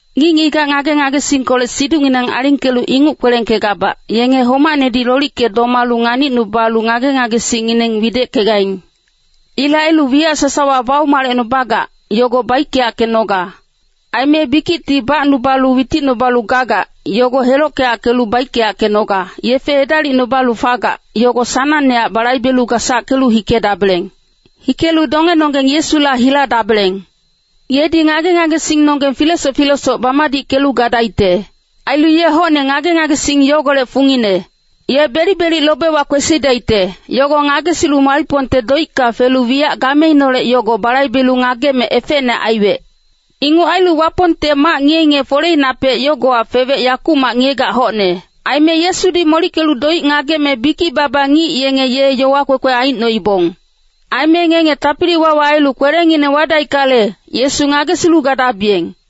Ngic-ngigac ngage-ngagesingkolec siducngineng alingkelu inguc kwelengkegabac, yenge homacnedi lolicke domalu nganicnubalu ngage-ngagesingngineng wideckegaing. Ilec ailu wiyac sasawa baumalecnubagac, yogo baickeyackenoga. Aime bikicti bacnubalu witicnubalu gagac, yogo helockeyackelu baickeyackenoga, yefe edalicnubalu fagac, yogo sanangnehac balaibelu gasackelu hikedabeleng. Hikelu dongenonggeng Yesula hiladabeleng. Yedi ngage-ngagesingnonggeng filesoc filesoc bamadickelu gadaicte. Ailu ye hocne ngage-ngagesing yogolec fungine. Ye belic-belic lobewa kwesidaicte, yogo ngagesilu malicpongte doicka felu wiyac gameineholec yogo balaibelu ngageme efecne aiwec. Inguc ailu Wapongte mac ngiye-ngiye foleinapec yogowa fewec yakumac ngiyegac hocne. Aime Yesudi molickelu doic ngageme bikic-baba ngic yenge ye yowa kwekwe aicnoibong. Aime ngenge tapili-wawa ailu kwelengineng wadaickale, Yesu ngagesilu gadabiyeng.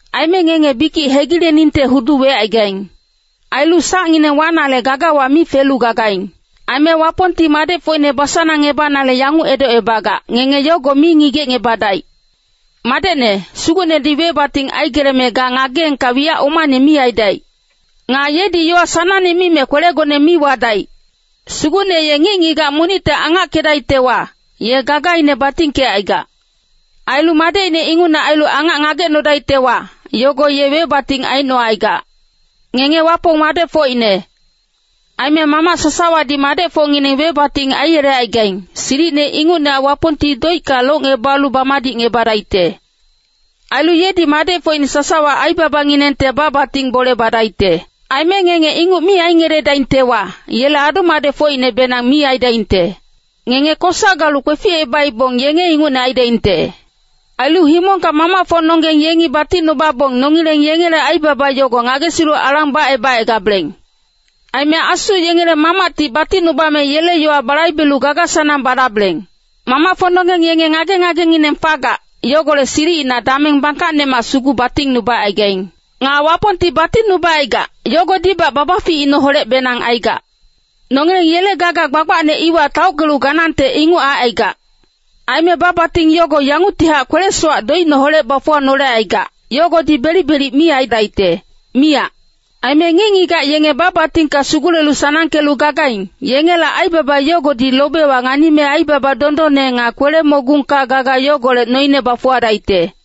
Aime ngenge bikic hegileningte hudu wecaigaing. Ailu sacngineng wanale gagawa mi felu gagaing. Aime Wapongti madecfocine basanangngebanale yanguc edocngebagac, ngenge yogo mi ngigecngebadaic. “Madecne, Sugucnedi webating aigeleme ga ngageengka wiyac omane mi aidaic. Nga yedi yowa sanangne mime kwelegone mi wadaic. Sugucne ye ngic-ngigac monicte angackedaictewa, ye gagaine batingkecaigac. Ailu madecine ingucne ailu angac ngagecnodaictewa, yogo ye webating aicnocaigac.” Ngenge Wapong madecfocine. Aime mamac sasawadi madecfocngineng webating aiyelecaigaing, silicine ingucnehac Wapongti doicka locngebalu bamadicngebadaicte. Ailu yedi madecfocine sasawa aibabanginengte ba-bating bole badaicte. Aime ngenge inguc mi aingeledaictewa, yele adu-madecfocinebenang mi aidaingte. Ngenge kosa galu kweficebaibong yenge ingucne aidaingte. Ailu himongka mamacfocnonggeng yengi batingnubabong nongileng yengele aibaba yogo ngagesilu alang bacebacaigabeleng. Aime asu yengele Mamacti batingnubame yele yowa balaibelu gaga-sanang badabeleng. Mamacfocnonggeng yenge ngage-ngagengineng fagac, yogolec silicina dameng bangkacnemac sugu batingnubacaigaing. Nga Wapongti batingnubacaigac, yogodibac babaficineholecbenang aigac. Nongileng yele gaga gbagbacne iwa taockelu ganangte inguc aicaigac. Aime ba-bating yogo yanguctihac kwele-sowac doicineholec bafuwanolecaigac, yogodi belic-belic mi aidaicte, miyac. Aime ngic-ngigac yenge ba-batingka sugule-sanangkelu gagaing, yengela aibaba yogodi lobewa nganime aibaba dondonne nga kwele-mogungka gaga yogolec noine bafuwadaicte.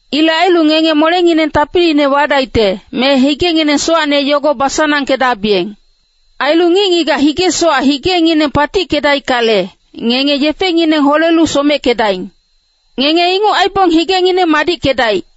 Ilec ailu ngenge molengineng tapiliine wadaicte, me higengineng sowacne yogo basanangkedabiyeng. Ailu ngic-ngigac hige-sowac higengineng patickedaickale, “Ngenge yefengineng holelu someckedaing.” Ngenge inguc aibong higengineng madickedaic.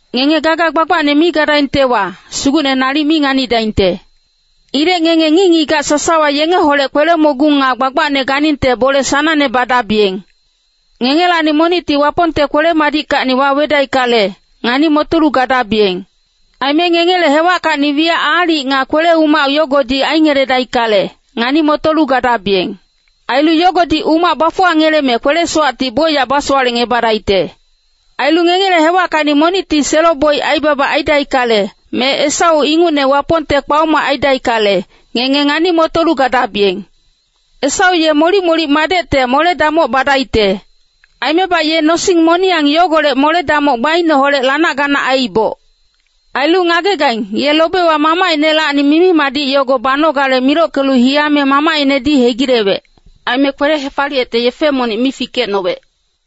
Ngenge gaga gbagbacne mi gadaingtewa, Sugucne nalic mi nganidaingte. Ilec ngenge ngic-ngigac sasawa yengeholec kwele-mogung nga gbagbacne ganingte bole sanangne badabiyeng. Ngengelacni monicti Wapongte kwele-madickacni wawedaickale, ngani-motolu gadabiyeng. Aime ngengele hewackacni wiyac aalic nga kwele-umac yogodi aingeledaickale, ngani-motolu gadabiyeng. Ailu yogodi umac bafuwangeleme kwele-sowacti bocyac basowalecngebadaicte. Ailu ngengele hewackacni monicti selo-boic aibaba aidaickale, me Esau ingucne Wapongte kpaoma aidaickale, ngenge ngani-motolu gadabiyeng. Esau ye molic-molic madecte mole-damoc badaicte. Aimebac ye nosing moniyang yogolec mole-damoc gbaineholec lanac-ganac aiiboc. Ailu ngagegaing, ye lobewa mamacinelacni mimi-madic yogo banogale milockelu hiyame mamacinedi hegilewec. Aime kwele-hefaliyecte yefe monic mi fikecnowec.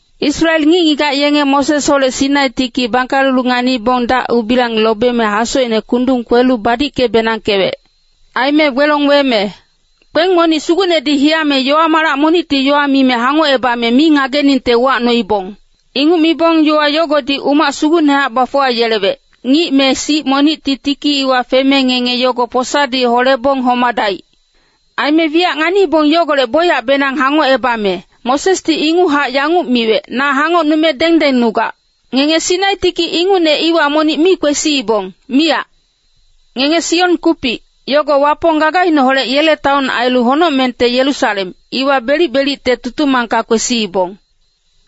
Israel ngic-ngigac yenge Mosesholec Sinai tiki bangkalelu nganibong dac-ubilang lobeme hasocine kundung kwelu badicke-benangkewec. Aime gbelong weme kpeng monic sugucnedi hiyame yowa-malac monicti yowa mime hangocebame mi ngageningte uwacnoibong. Inguc mibong, yowa yogodi umac sugucnehac bafuwayelewec, “Ngic me sic monicti tiki iwa feme ngenge yogo posadi holebong homadaic.” Aime wiyac nganiibong yogolec bocyacbenang hangocebame, Mosesdi inguchac yanguc miwec, “Na hangocnume dengdengnugac.” Ngenge Sinai tiki ingucne iwa monic mi kwesiibong, miyac. Ngenge Sion kupic, yogo Wapong gagaineholec yele taon ailu honocmengte Yerusalem, iwa belic-belicte tutumangka kwesiibong.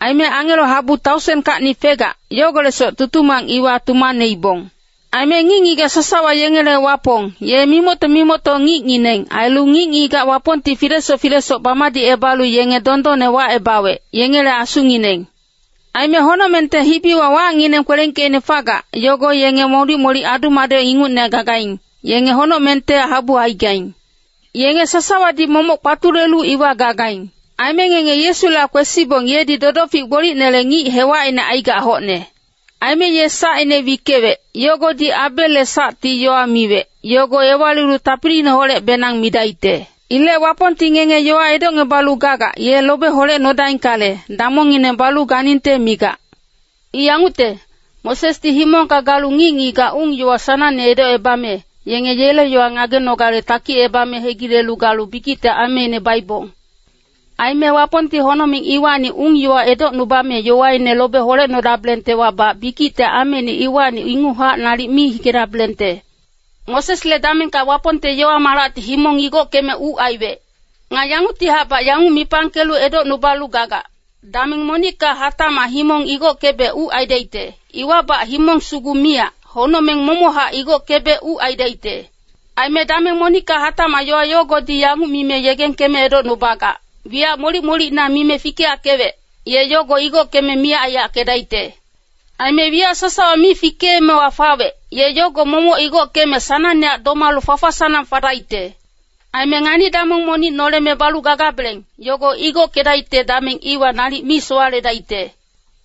Aime angelo habu taosenkacni fegac, yogolecsoc tutumang iwa tumaneibong. Aime ngic-ngigac sasawa yengele Wapong, ye mimocto-mimocto ngicngineng, ailu ngic-ngigac Wapongti filesoc filesoc bamadicebalu yenge dondonne wacebawec, yengele asungineng. Aime honocmengte hibiwa wacngineng kwelengkeicne fagac, yogo yenge molic-molic adu-madec ingucne gagaing, yenge honocmengte habu aigaing. Yenge sasawadi momoc kpatulelu iwa gagaing. Aime ngenge Yesula kwesibong yedi dodofic gbolicnele ngic hewacine aigac hocne. Aime ye sacine wickewec, yogodi Abelle sacti yowa miwec, yogo ewalilu tapiliineholecbenang midaicte. Ilec Wapongti ngenge yowa edocngebalu gagac, ye lobe holecnodaingkale, damongngineng balu ganingte migac. I yangucte, Mosesdi himongka galu ngic-ngigac ung-yowa sanangne edocebame, yenge yele yowa ngagenogale takicebame hegile galu bikicte ameine baibong. Aime Wapongti honocmeng iwacni ung-yowa edocnubame yowaine lobe holedabelengtewabac bikicte ameine iwacni inguchac nalic mi hikedabelengte. Mosesle damengka Wapongte yowa-malacti himong igockeme uc aiwec. Nga yanguctihacbac yanguc mipangkelu edocnubalu gagac, “Dameng monicka hatacmac himong igockebe uc aidaicte, iwabac himong sugu miyac, honocmeng momochac igockebe uc aidaicte.” Aime “dameng monicka hatacmac” yowa yogodi yanguc mime yegengkeme edocnubagac, wiyac molic-molicina mime fikeyackewec, ye yogo igockeme miyac aiyackedaicte. Aime wiyac sasawa mi fikeemewa fawec, ye yogo momoc igockeme sanangnehac domalu fafa-sanang fadaicte. Aime ngani-damong monic noleme balu gagabeleng, yogo igockedaicte dameng iwa nalic mi sowaledaicte.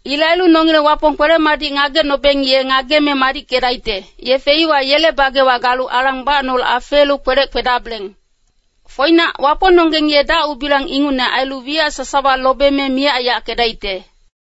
Ilec ailu nongileng Wapong kwele-madic ngagecnobeng ye ngageme madickedaicte, yefe iwa yele bagewa galu alang bacnolu afeelu kwelec kwedabeleng. “Foinac, Wapongnonggeng ye dac-ubilang ingucne ailu wiyac sasawa lobeme miyac aiyackedaicte.”